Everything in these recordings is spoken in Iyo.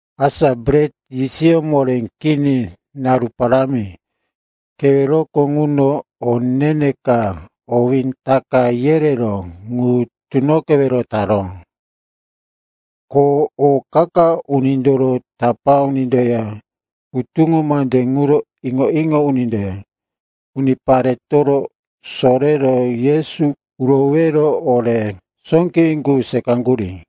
Asa Bret Yisiyó Moré Kini naru parámi keweroko ŋuno o ne-ne ka, owé Taka yereró, ŋu tunoqewero taró. Ko o qa-qa unindoro tapá unindoya hutuŋo mande ŋuro iŋo-iŋo unindoya uniparetoro sorero Yesu urowero ore sóqewí qu seqaŋgurí.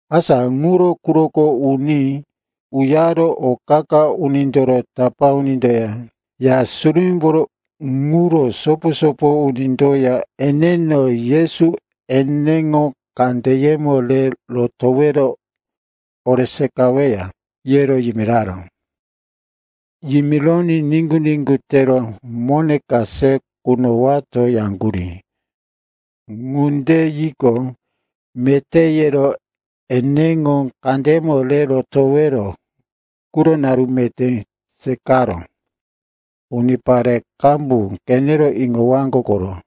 Asa ŋuro quroko uní uyaro o qa-qa unindoro tapá unindoya Ya Surumímboro ŋuro sopo-sopo unindoya eneno, Yesu eneŋo kandeyemo re rotowero ore seqaweya, yero yimiraró. Yimironí niŋgu-niŋgu tero, mone ka se kunowato, yaŋgurí. Ŋunde yiqo, meté, yero eneŋo kandeyemo re rotowero quro naru meté seqaró. Unipare qambu qenero iŋowaŋgo koro.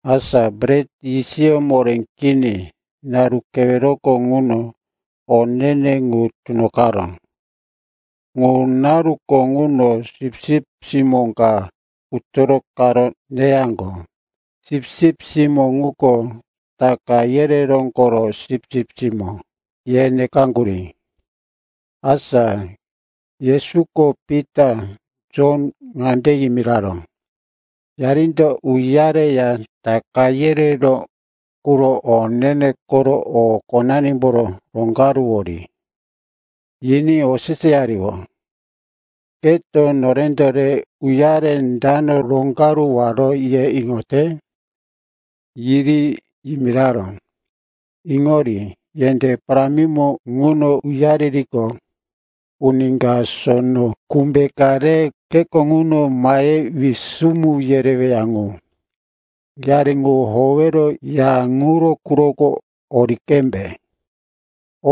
Asa Bret Yisiyó Moré Kini naru keweroko ŋuno o ne-ne ŋu tunoqaró. Ŋu naruko ŋuno sipsip simó ka utoro qaro neyaŋgo. Sipsip simó ŋuko, “Taka yereró koro sipsip simó,” ye nekaŋgurí. Asa Yesuko Pita, Jon ŋande yimiraró, “Yarindo uyareya Taka yereró quro o ne-ne koro o qonanimboro roŋgaruwori.” Yiní oseseyariyó, “Keto, norendo re uyare dano roŋgaruwaro, ye iŋote?” Yiri yimiraró, “Iŋori. Yendé parámimo ŋuno uyaririqo, uni kato sono kumbe ka re kheko ŋuno mahe wisumu yereweya ŋu. Yari ŋu howero ya ŋuro quroko ori qembe.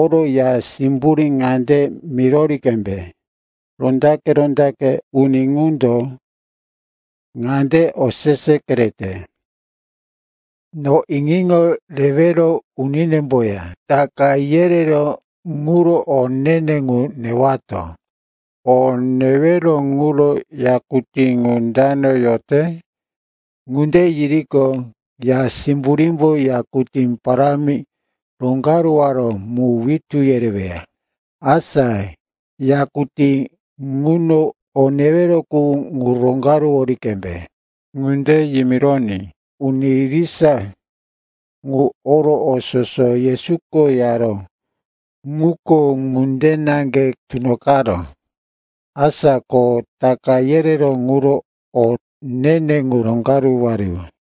Oro ya simburí ŋande mirori qembe, ‘Rondaqe-rondaqe uni ŋundo ŋande osese kerete: No iŋo-iŋo rewero uninemboya Taka yereró quro o ne-ne ŋu newato. O newero ŋuro yakutí ŋu dana yote?’ Ŋunde yiriqo, ya simburímbo yakutí parámi roŋgaruwaró mu witú yereweya. Asa yakutí ŋuno o newero ŋu roŋgaruwori qembe.” Ŋunde yimironí uni irisa ŋu oro o soso Yesuko yaró ŋuko ŋunde naŋge tunoqaró. Asa ko Taka yereró quro o ne-ne ŋu roŋgaruwariyó.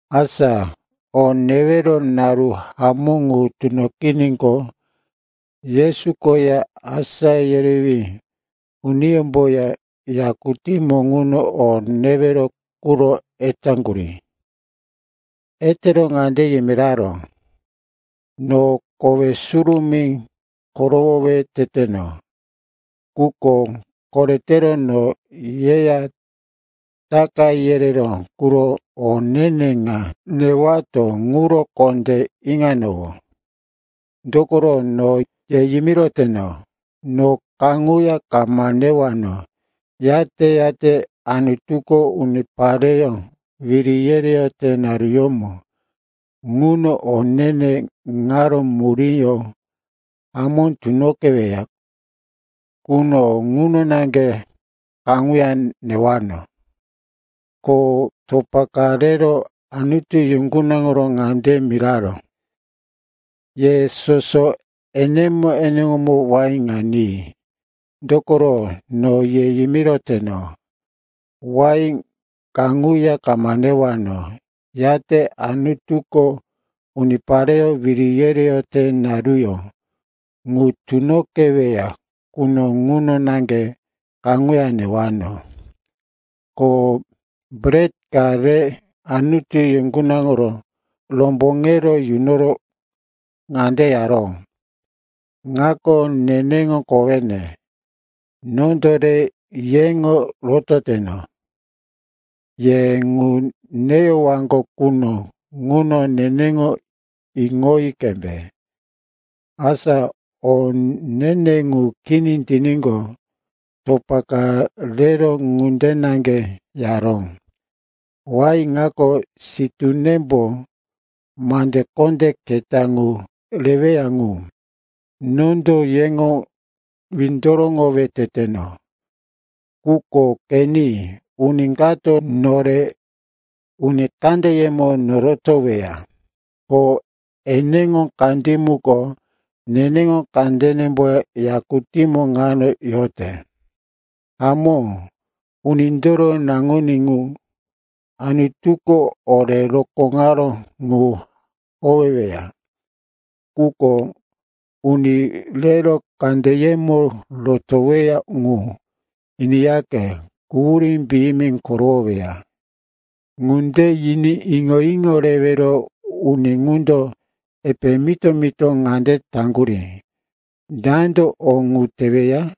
Asa o newero naru hamó ŋu tunoqiníqo, Yesu koya asá yerewí uniyómboya yakutí ŋuno o newero quro etaŋgurí. Etero ŋande yimiraró, “No kowe surumí korowowe teteno. Quko koretero no yeya Taka yereró quro o ne-ne ŋa newato ŋuro kondé iŋanowó. Dokoro no ye yimiroteno, no kaŋuya kama newano, yate-yate Anutuko unipareyó wiri yereyote naruyómo ŋuno o ne-ne ŋaro muríyó hamó tunoqeweya quno, ŋuno naŋge kaŋuya newano.” Ko topa ka rero, Anutu yuŋgunaŋoro ŋande yimiraró, “Ye soso enemo-enemo wain ŋa ni. Dokoro no ye yimiroteno, wain kaŋuya kama newano, yate Anutuko unipareyó wiri yereyote naruyó ŋu tunoqeweya quno, ŋuno naŋge kaŋuya newano.” Ko bret ka rero, Anutu yuŋgunaŋoro romboŋero yunoro ŋande yaró, “Ŋako neneŋo kowene. Nondo re yeŋo rototeno. Ye ŋu neyowaŋgo quno ŋuno neneŋo iŋoyi qembe.” Asa o ne-ne ŋu kini tiníqo, topa ka rero ŋunde naŋge yaró, “Wain ŋako sitúnembo mande kondé keta ŋu reweya qu. Nondo yeŋo windoroŋowe teteno. Quko qeni, uni kato nore uni kandeyemo norotoweya, ko eneŋo kandí muko neneŋo kandenemboya yakutímo ŋano yote. Hamó, Unindoro Naŋuní ŋu Anutuko ore rokóŋaró ŋu howeweya. Quko uni rero kandeyemo rotoweya ŋu, iniyaqe, quhurí piyimi korowoweya.” Ŋunde yiní iŋo-iŋo rewero uni ŋundo epe mito-mito ŋande taŋgurí, “Dando o ŋu teweya?”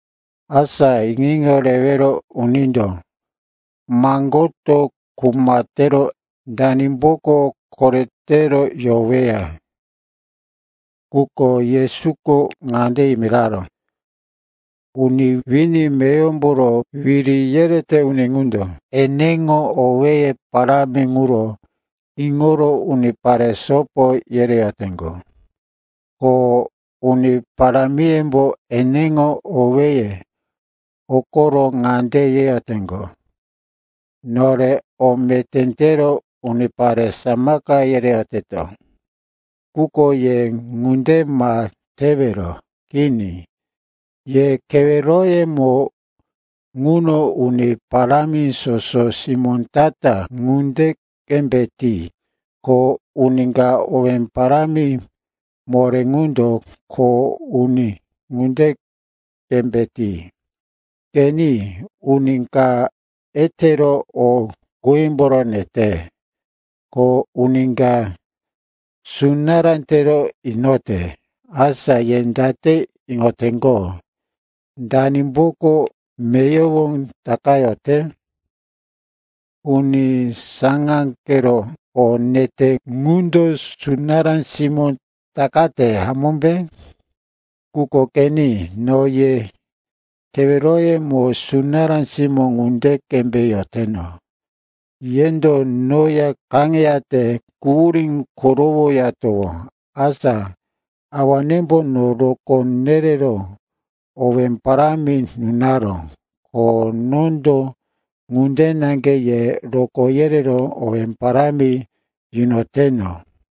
Asa iŋo-iŋo rewero unindo maŋgoto kuma tero danimboko koretero yoweya. Quko Yesuko ŋande yimiraró, “Uni wini meyowomboro wiri yerete uni ŋundo eneŋo owéye parámi ŋuro iŋoro unipare sopo yereyoteŋgo. Ko uni parámiyembo eneŋo owéye hokoro ŋande yeyoteŋgo, ‘Nore o meté tero unipare samaka yereyoteto.’ Quko ye ŋunde ma tewero. Kini, ye keweroyemo ŋuno uni parámi soso simó ta-ta ŋunde qembe ti. Ko uni ka owé parámi moré ŋundo kho uni ŋunde qembe ti. Qeni, uni ka etero o qímboro nete, ko uni ka sunará tero inote. Asa ye date iŋoteŋgo, danimboko meyowo takayote? Uni saŋáqero o nete ŋundo sunará simó takate, hamómbe? Quko qeni, no ye keweroyemo sunará simó ŋunde qembe yoteno. Yendo noya kaŋeyate quhurí korowoyatowó. Asa Awanembo no rokó nerero owé parámi nunaró, ko nondo ŋunde naŋge ye rokó yerero owé parámi yunoteno.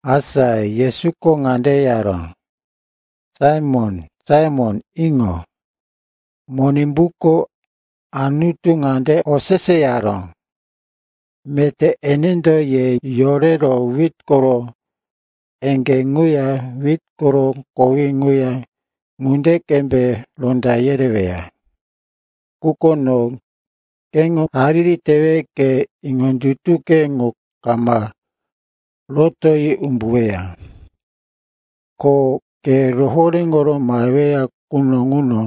Asa Yesuko ŋande yaró, “Saimon, Saimon, iŋo. Monimbuko Anutu ŋande oseseyaró, meté enendo ye yorero wit koro eŋgé ŋuya wit koro kowí ŋuya ŋunde qembe ronda yereweya. Quko no keŋo hariri tewe ke iŋondutuke ŋu kama rotoyi umbuweya. Ko ke rohoréŋo maheweya quno ŋuno,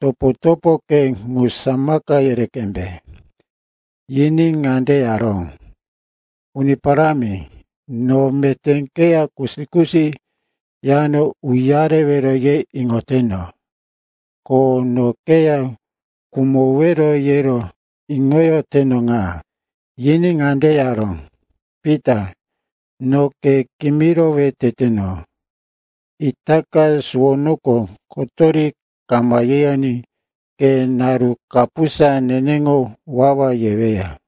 topo-topoke ŋu samaka yere qembe.” Yiní ŋande yaró, “Uni Parámi, no meté keya kusi-kusi yano uyarewero ye iŋoteno. Ko no keya khumowero yero iŋoyoteno ŋa.” Yiní ŋande yaró, “Pita, no ke kimirowe teteno, itaka suwonoko kotori kama yeyoní ke naru kapusa neneŋo wawa yeweya.”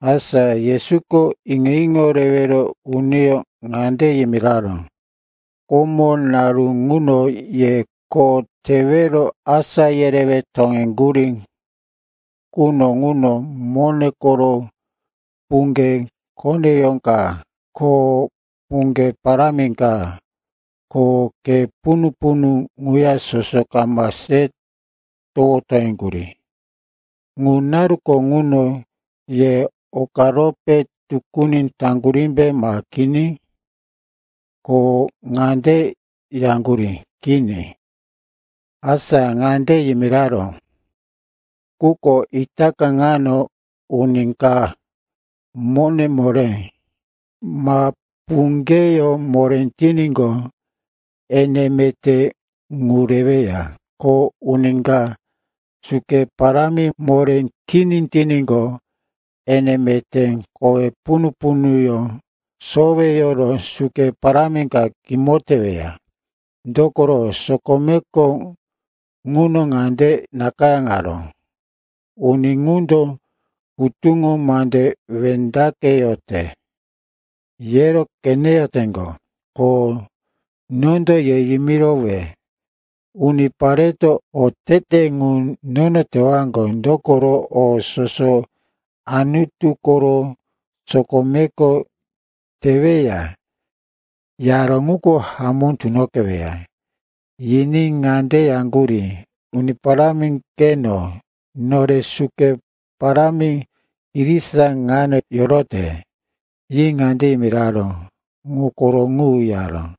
Asa Yesuko iŋo-iŋo rewero uniyó ŋande yimiraró, “Komo, naru ŋuno ye kho tewero asá yerewe toŋeŋgurí quno ŋuno mone koro puŋge koneyó ka ko puŋge parámi ka ko khe punu-punu ŋu soso kama se towo toŋeŋgurí. Ŋu naruko ŋuno ye okarope tukuni taŋgurímbe ma kini?” Ko ŋande yaŋgurí, “Kini.” Asa ŋande yimiraró, “Quko itaka ŋano uni ka mone moré, ma puŋgeyó moré tiníqo, ene meté ŋu reweya. Ko uni ka suke parámi moré kini tiníqo, ene meté kowe punu-punuyó soweyoro suke parámi ka kimo teweya. Dokoro sokomeko ŋuno ŋande nakayáŋaró, ‘Uni ŋundo hutuŋo mande wendaqeyote yero qeneyoteŋgo.’ Ko nondo ye yimirowe, unipareto otete ŋu nono tewaŋgo, dokoro o soso Anutu koro sokomeko teweya yaró ŋuko hamó tunoqeweya.” Yiní ŋande yaŋgurí, “Uni Parámi, qeno. Nore suke parámi irisa ŋano yorote.” Yi ŋande yimiraró, “Ŋu koro ŋu,” yaró.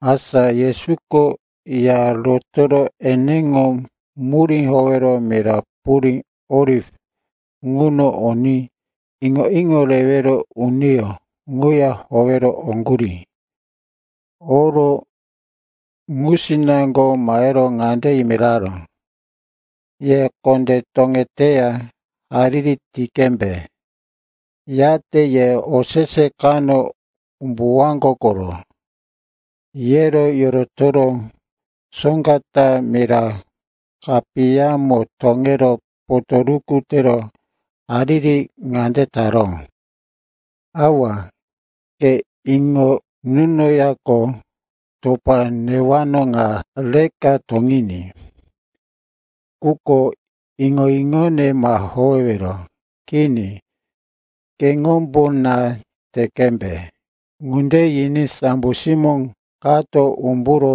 Asa Yesuko ya rotoro eneŋo murí howero mira purí Oliv ŋuno oní iŋo-iŋo rewero uniyó ŋuya howero oŋgurí. Oro ŋusinaŋgo mahero ŋande yimiraró, “Ye kondé toŋeteya hariri ti qembe. Yate ye osese kano umbuwaŋgo koro.” Yero yorotoro soŋga ta mira kapiyamo toŋero potoruku tero hariri ŋande taró, “Awa, ke iŋo nunoyaqo, topa newano ŋa reka toŋiní. Quko iŋo-iŋone ma howewero. Kini, keŋombo na te qembe.” Ŋunde yiní sambo simó kato umburo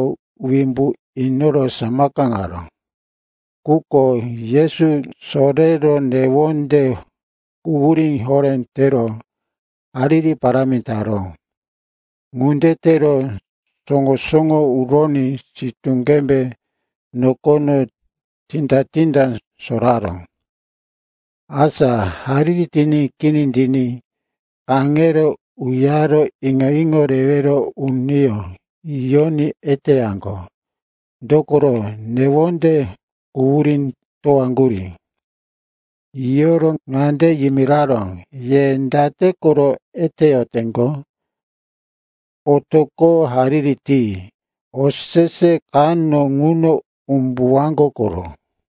wimbu inoro samakaŋaró. Quko Yesu sorero newonde quhurí horé tero hariri parámi taró. Ŋunde tero soŋo-soŋo uroní sitú qembe nokono tinda-tinda soraró. Asa hariri tiní kini tiní kaŋero uyare iŋo-iŋo rewero uniyó yiyoní eteyaŋgo, dokoro newonde quhurí towaŋgurí. Yiyoro ŋande yimiraró, “Ye date koro eteyoteŋgo? Otoqo hariri ti. Osese kano ŋuno umbuwaŋgo koro.”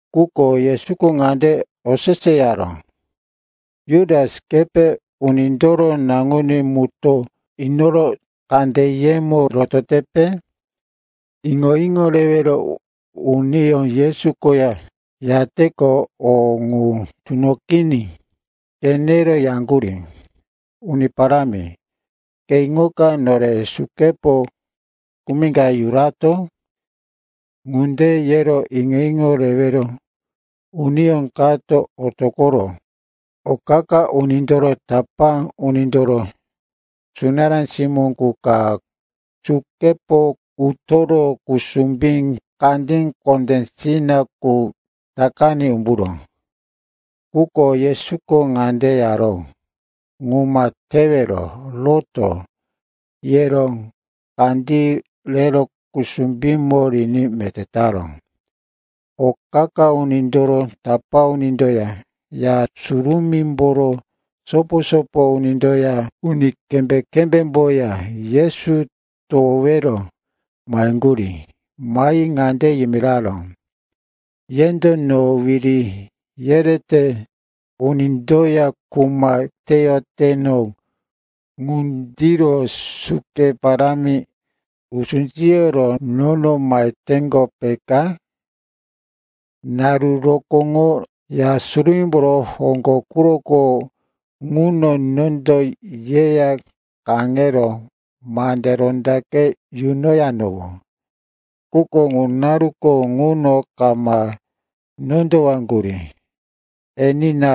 Quko Yesuko ŋande oseseyaró, “Jutas, kepe Unindoro Naŋuní mutó inoro kandeyemo rototepe?” Iŋo-iŋo rewero uniyó Yesu koya yateqo o ŋu tunoqiní qenero yaŋgurí, “Uni Parámi, ke iŋoka nore sukepo kumi ka yurato?” Ŋunde yero iŋo-iŋo rewero uniyó kato otoqoro o qa-qa unindoro tapá unindoro sunará simó qu ka sukepo utoro kusumbí kandí kondéwore qu takaní umburó. Quko Yesuko ŋande yaró, “Ŋu ma tewero! Roto!” yero kandí rero kusumbímo riní meté taró. O qa-qa unindoro tapá unindoya Ya Surumímboro sopo-sopo unindoya uni kembé-kembémboya Yesu towowero maheŋgurí. Mahi ŋande yimiraró, “Yendo no wiri yerete unindoya kuma teyoteno ŋundiro suke parámi, usú siyoro nono maheteŋgo, peka? Naru rokóŋo Ya Surumímboro hoŋgo quroko ŋuno nondo yeya kaŋero mande rondaqe yunoyanowó. Quko ŋu naruko ŋuno kama nondowaŋgurí. Enina,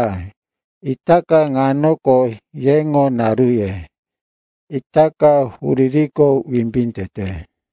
itaka ŋanoko yeŋo naruye. Itaka huririko wimbí tete.”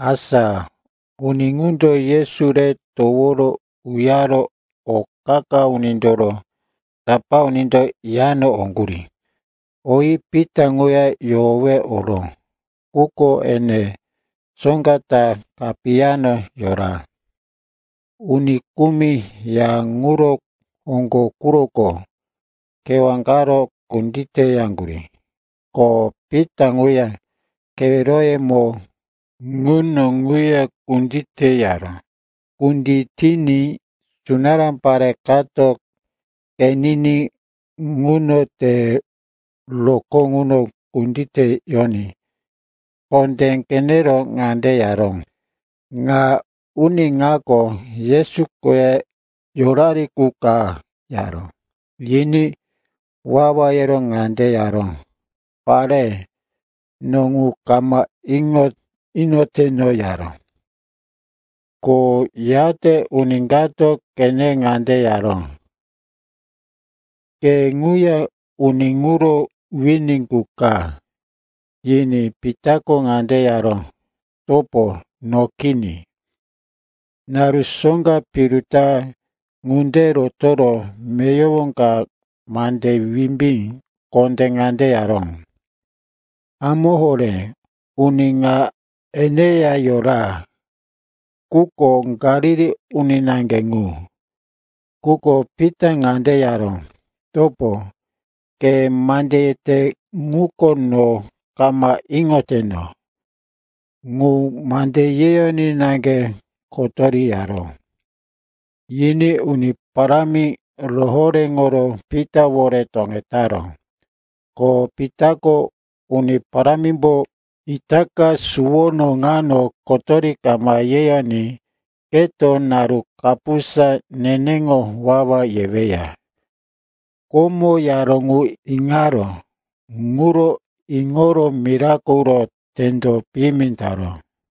Asa uni ŋundo Yesu re toworo uyaro o qa-qa unindoro tapá unindo yano oŋgurí. Oyi Pita ŋuya yohowe oró, quko ene soŋga ta kapiyamo yora. Uni kumi ya ŋuro hoŋgo quroko kewá qaro kunditeyaŋgurí. Ko Pita ŋuya keweroyemo ŋuno ŋuya kunditeyaró. Kunditiní sunará pare kato qenini ŋuno te roko ŋuno kunditeyoní kondé qenero ŋande yaró, “Ŋa uni ŋako Yesu koya yorari qu ka,” yaró. Yiní wawa yero ŋande yaró, “Pare, no ŋu kama iŋo inoteno,” yaró. Ko yate uni kato qenero ŋande yaró, “Ke ŋuya uni ŋuro wini qu ka.” Yiní Pitako ŋande yaró, “Topo, no kini.” Naru soŋga piru ta ŋunde rotoro meyowo ka mande wimbí kondé ŋande yaró, “Hamó horé, uni ŋa eneya yora. Ŋuko Galili uni naŋge ŋu.” Quko Pitako ŋande yaró, “Topo, ke mande yete ŋuko no kama iŋoteno.” Ŋu mande yeyoní naŋge kotori yaró. Yiní Uni Parámi rohoréŋoro Pitawore toŋetaró. Ko Pitako Uni Parámimbo, “Itaka suwono ŋano kotori kama yeyoní keto naru kapusa neneŋo wawa yeweya,” komo yaró ŋu iŋaró. Ŋuro iŋoro mirako uro tendo piyimi taró.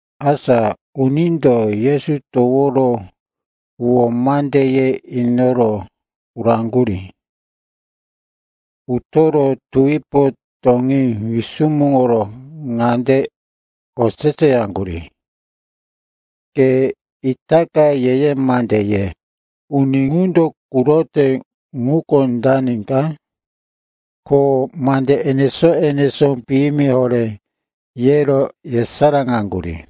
Asa unindo Yesu toworo huwó mande ye inoro uraŋgurí. Utoro tuwipo toŋí wisumuŋoro ŋande oseseyaŋgurí, “Ke itaka ye-ye mande ye. Uni ŋundo kurote ŋuko dani ka?” Ko mande enesó-enesó piyimi horé yero yesaráŋaŋgurí.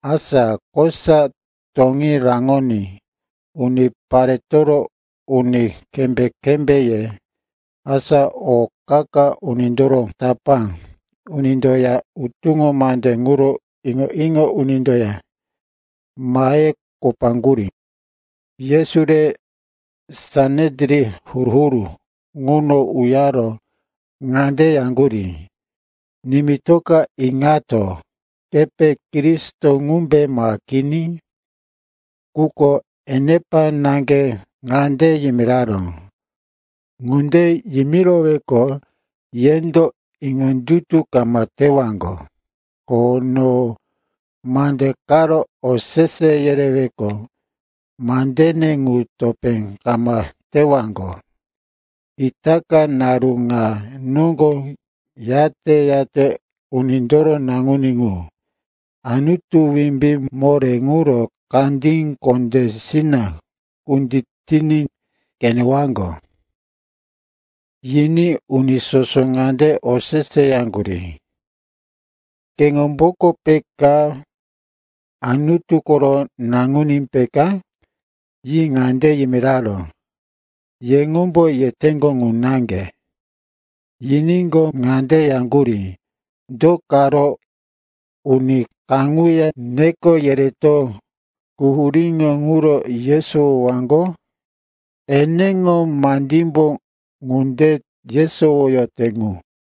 Asa kosa toŋí raŋoní uniparetoro uni kembé-kembéye, asa o qa-qa unindoro tapá unindoya hutuŋo mande ŋuro iŋo-iŋo unindoya mahero kopaŋgurí. Yesu re Sanedrin huru-huru ŋuno uyaro ŋande yaŋgurí, “Nimitoka iŋato. Kepe Kristo ŋumbe ma kini?” Quko enepa naŋge ŋande yimiraró, “Ŋunde yimiroweqo, yendo iŋondutu kama tewaŋgo. Ko no mande karo osese yereweqo, mandene ŋu topé kama tewaŋgo. Itaka naru ŋa noŋgo yate-yate Unindoro Naŋuní ŋu Anutu wimbí moré ŋuro kandí kondésina kunditiní qenewaŋgo.” Yiní uni soso ŋande oseseyaŋgurí, “Keŋomboko peka Anutu koro naŋuní peka?” Yi ŋande yimiraró, “Yeŋombo yeteŋgo ŋu naŋge.” Yiníqo, ŋande yaŋgurí, “Do karo uni kaŋuya neko yereto quhuríŋo ŋuro yesowowaŋgo? Eneŋo mandímbo ŋunde yesowoyote ŋu.”